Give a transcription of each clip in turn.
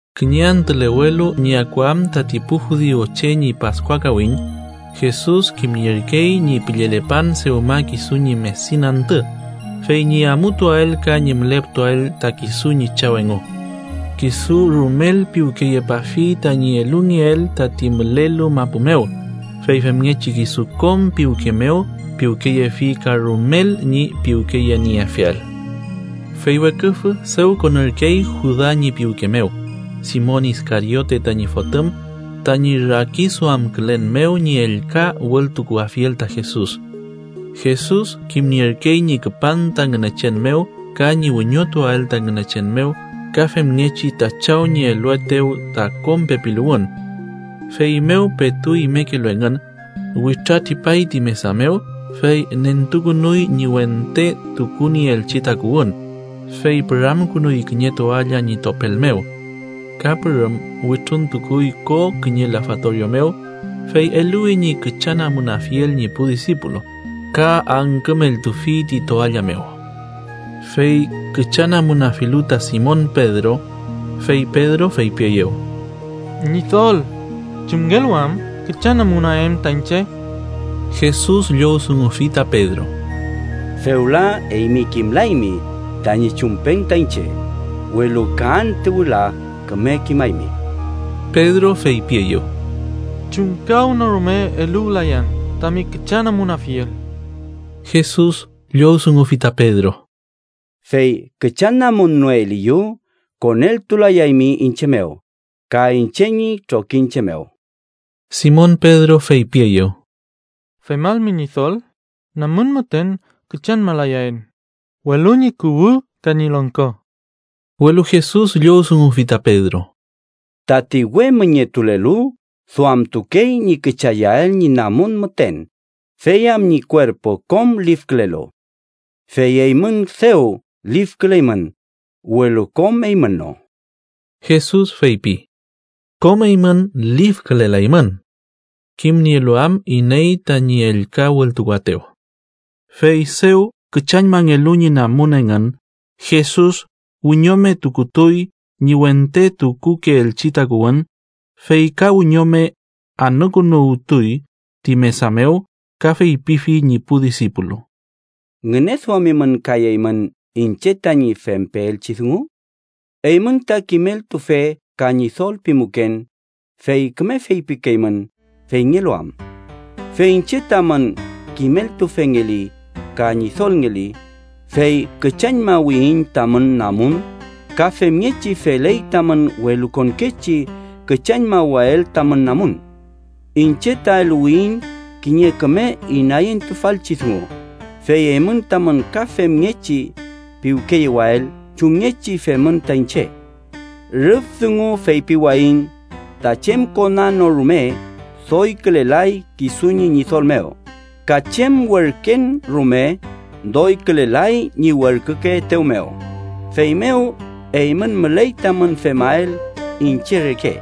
Kiñe antülewelu ñi akuam tati pu judiu che ñi Paskua kawiñ, Jesus kimnierkey ñi püllelepan dewma kisu ñi medin antü, fey ñi amutuael ka ñi müleputuael ta kisu ñi Chaw engu. Kisu rumel piwkeyepafi tañi elungeel tati mülelu mapu mew, fey femngechi kisu kom piwke mew piwkeyefi ka rumel ñi piwkeyenieafiel. Fey weküfü dew konürkey Juda ñi piwke mew, Simon Iskariote tañi fotüm, tañi rakiduamkülen mew ñi ellka wültukuafiel ta Jesus. Jesus kimnierkey ñi küpan ta Ngünechen mew ka ñi wiñotuael ta Ngünechen mew ka femngechi ta Chaw ñi eluetew ta kom pepiluwün. Feymew petu imekelu engün, witratripay ti mesa mew, fey nentukünuy ñi wente tukunieelchi takuwün, fey püramkünuy kiñe toalla ñi topel mew. Ka pürüm wütruntukuy ko kiñe lafatorio mew, fey eluwi ñi küchanamunafiel ñi pu disipulu ka angkümeltufi ti toalla mew. Fey küchanamunafilu ta Simon Pedro, fey Pedro feypieyew: —Ñidol, ¿chumngelu am küchanamunaen ta iñche? Jesus llowdungufi ta Pedro: —Fewla eymi kimlaymi tañi chumpen ta iñche, welu ka antü wüla küme kimaymi. Pedro feypieyew: —¡Chumkawnorume eluwlayan tami küchanamunafiel! Jesus llowdungufi ta Pedro: —Fey küchanamunnoeliyu, koneltulayaymi iñche mew ka iñche ñi trokiñche mew. Simon Pedro feypieyew: —¡Femalmi Ñidol, namun müten küchañmalayaen, welu ñi kuwü ka ñi longko! Welu Jesus llowdungufi ta Pedro: —Tati we müñetulelu duamtukey ñi küchayael ñi namun müten fey am ñi kuerpu kom lifkülelu. Fey eymün dew lifküleymün, welu kom eymün no. Jesus feypi: “Kom eymün lifkülelaymün”, kimnielu am iney tañi ellka wültukuaetew. Fey dew küchañmangelu ñi namun engün Jesus, wiñome tukutuy ñi wente tukukeelchi takuwün, fey ka wiñome anükünuwtuy ti mesa mew ka feypifi ñi pu disipulu: —¿Ngüneduamimün kay eymün iñche tañi fempeelchi dungu? Eymün ta kimeltufe ka Ñidol pimuken, fey küme feypikeymün feyngelu am. Fey iñche tamün kimeltufengeli ka Ñidolngeli, fey küchañmawiyiñ tamün namun, ka femngechi feley tamün welukonkechi küchañmawael tamün namun. Iñche ta eluwiyiñ kiñe küme inayentufalchi dungu, fey eymün tamün ka femngechi piwkeyewael chumngechi femün ta iñche. Rüf dungu feypiwayiñ ta chem kona no rume doykülelay kisu ñi ñidol mew, ka chem werken rume doykülelay ñi werkükeetew mew, feymew eymün müley tamün femael iñche reke.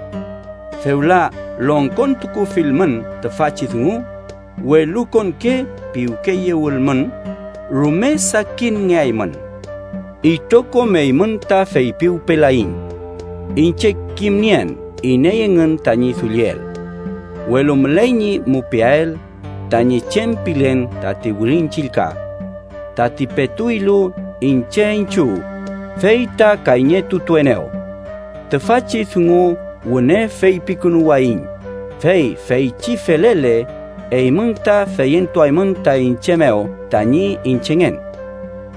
Fewla longkontukufilmün tüfachi dungu, welukonke piwkeyewülmün, rume sakinngeaymün. “Itrokom eymün ta feypiwpelayiñ: iñche kimnien iney engün tañi dulliel. Welu müley ñi mupiael tañi chem pilen tati Wirin Chillka: ‘Tati petu ilu iñche iñchiw, fey ta kayñetutuenew.’ Tüfachi dungu wüne feypikünuwayiñ, fey feychi felele, eymün ta feyentuaymün ta iñche mew tañi Iñchengen.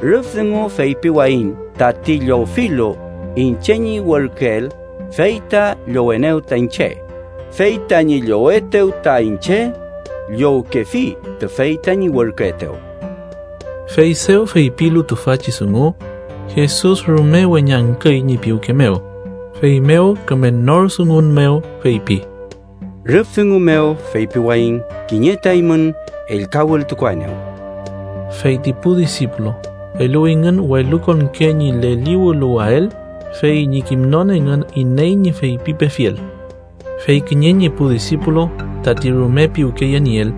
Rüf dungu feypiwayiñ tati llowfilu iñche ñi werküel, fey ta llowenew ta iñche, fey tañi llowetew ta iñche, llowkefi tüfey tañi werküetew.” Fey dew feypilu tüfachi dungu, Jesus rume weñangküy ñi piwke mew, feymew küme nor dungun mew feypi: —Rüf dungu mew feypiwayiñ kiñe ta eymün ellka wültukuaenew. Fey ti pu disipulu eluwingün welukonke ñi leliwüluwael fey ñi kimnon engün iney ñi feypipefiel. Fey kiñe ñi pu disipulu tati rume piwkeyenieel,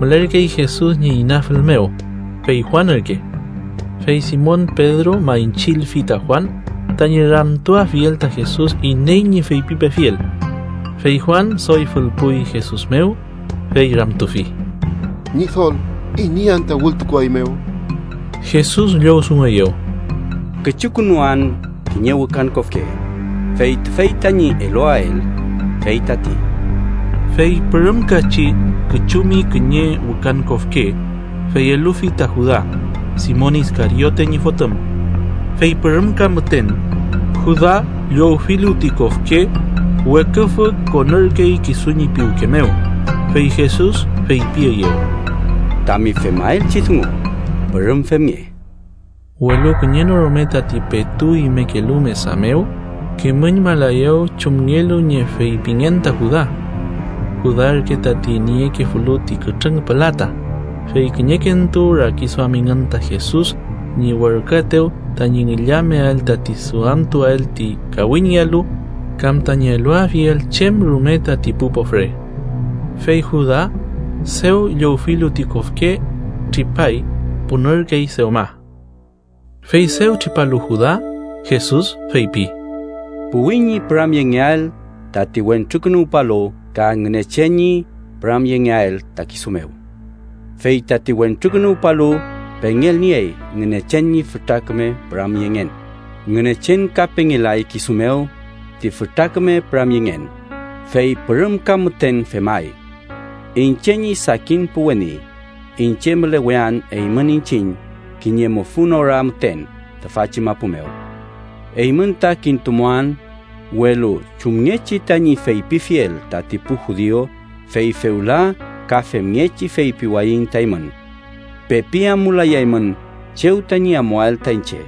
mülerkey Jesus ñi inafül mew, fey Juan ürke. Fey Simon Pedro maychülfi ta Juan tañi ramtuafiel ta Jesus iney ñi feypipefiel. Fey Juan doy fülpuy Jesus mew, fey ramtufi: —Ñidol ¿iney anta wültukuaeymew? Jesus llowdungueyew: —Küchukünuan kiñe wükan kofke, fey tüfey tañi eluael, fey tati. Fey pürümkachi küchumi kiñe wükan kofke, fey elufi ta Juda, Simon Iskariote ñi fotüm. Fey pürümka müten Juda, llowfilu ti kofke, weküfü konürkey kisu ñi piwke mew, fey Jesus feypieyew: —Tami femaelchi dungu, pürüm femnge. Welu kiñe no rume tati petu imekelu mesa mew kimüñmalaeyew chumngelu ñi feypingen ta Juda. Juda ürke tati niekefulu ti kütrüng pülata, fey kiñekentu rakiduamingün ta Jesus ñi werküetew tañi ngillameael tati duamtuel ti kawiñngealu kam tañi eluafiel chem rume tati pu pofre. Fey Juda, dew llowfilu ti kofke, tripay. Punürkey dewma. Fey dew tripalu Juda, Jesus feypi: —Puwi ñi püramyengeael tati Wentrukünuwpalu ka Ngünechen ñi püramyengeael ta kisu mew. Fey tati Wentrukünuwpalu pengelniey Ngünechen ñi fütra küme püramyengen, Ngünechen ka pengelay kisu mew ti fütra küme püramyengen, fey pürümka müten femay. Iñche ñi sakin pu weni, iñche mülewean eymün iñchiñ kiñe mufün ora müten tüfachi mapu mew. Eymün ta kintumuan, welu chumngechi tañi feypifiel tati pu judiu, fey fewla ka femngechi feypiwayiñ ta eymün: Pepi amulayaymün chew tañi amuael ta iñche.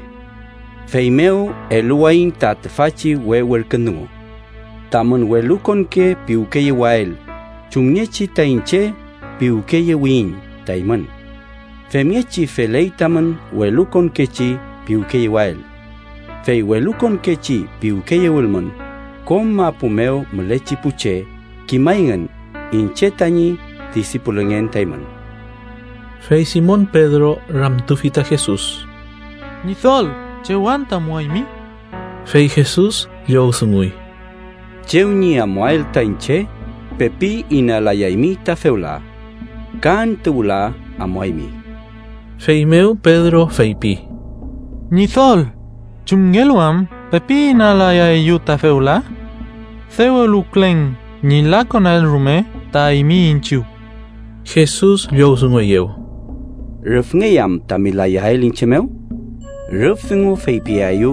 “Feymew eluwayiñ ta tüfachi we werkün dungu: Tamün welukonke piwkeyewael chumngechi ta iñche piwkeyewiyiñ ta eymün. Femngechi feley tamün welukonkechi piwkeyewael. Fey welukonkechi piwkeyewülmün, kom mapu mew mülechi pu che kimayngün iñche tañi disipulungen ta eymün.” Fey Simon Pedro ramtufi ta Jesus: —Ñidol ¿chew anta amuaymi? Fey Jesus llowdunguy: —Chew ñi amuael ta iñche, pepi inalayaymi ta fewla. Ka antü wüla amuaymi. Feymew Pedro feypi: —Ñidol, ¿chumngelu am pepi inalayaeyu ta fewla? ¡Dew eluwkülen ñi lakonael rume ta eymi iñchiw! Jesus llowdungueyew: —¿Rüfngey am tami layael iñche mew? Rüf dungu feypiaeyu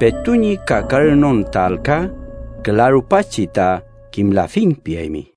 petu ñi kakaranon ta alka, küla rupachi ta “kimlafiñ” piaymi.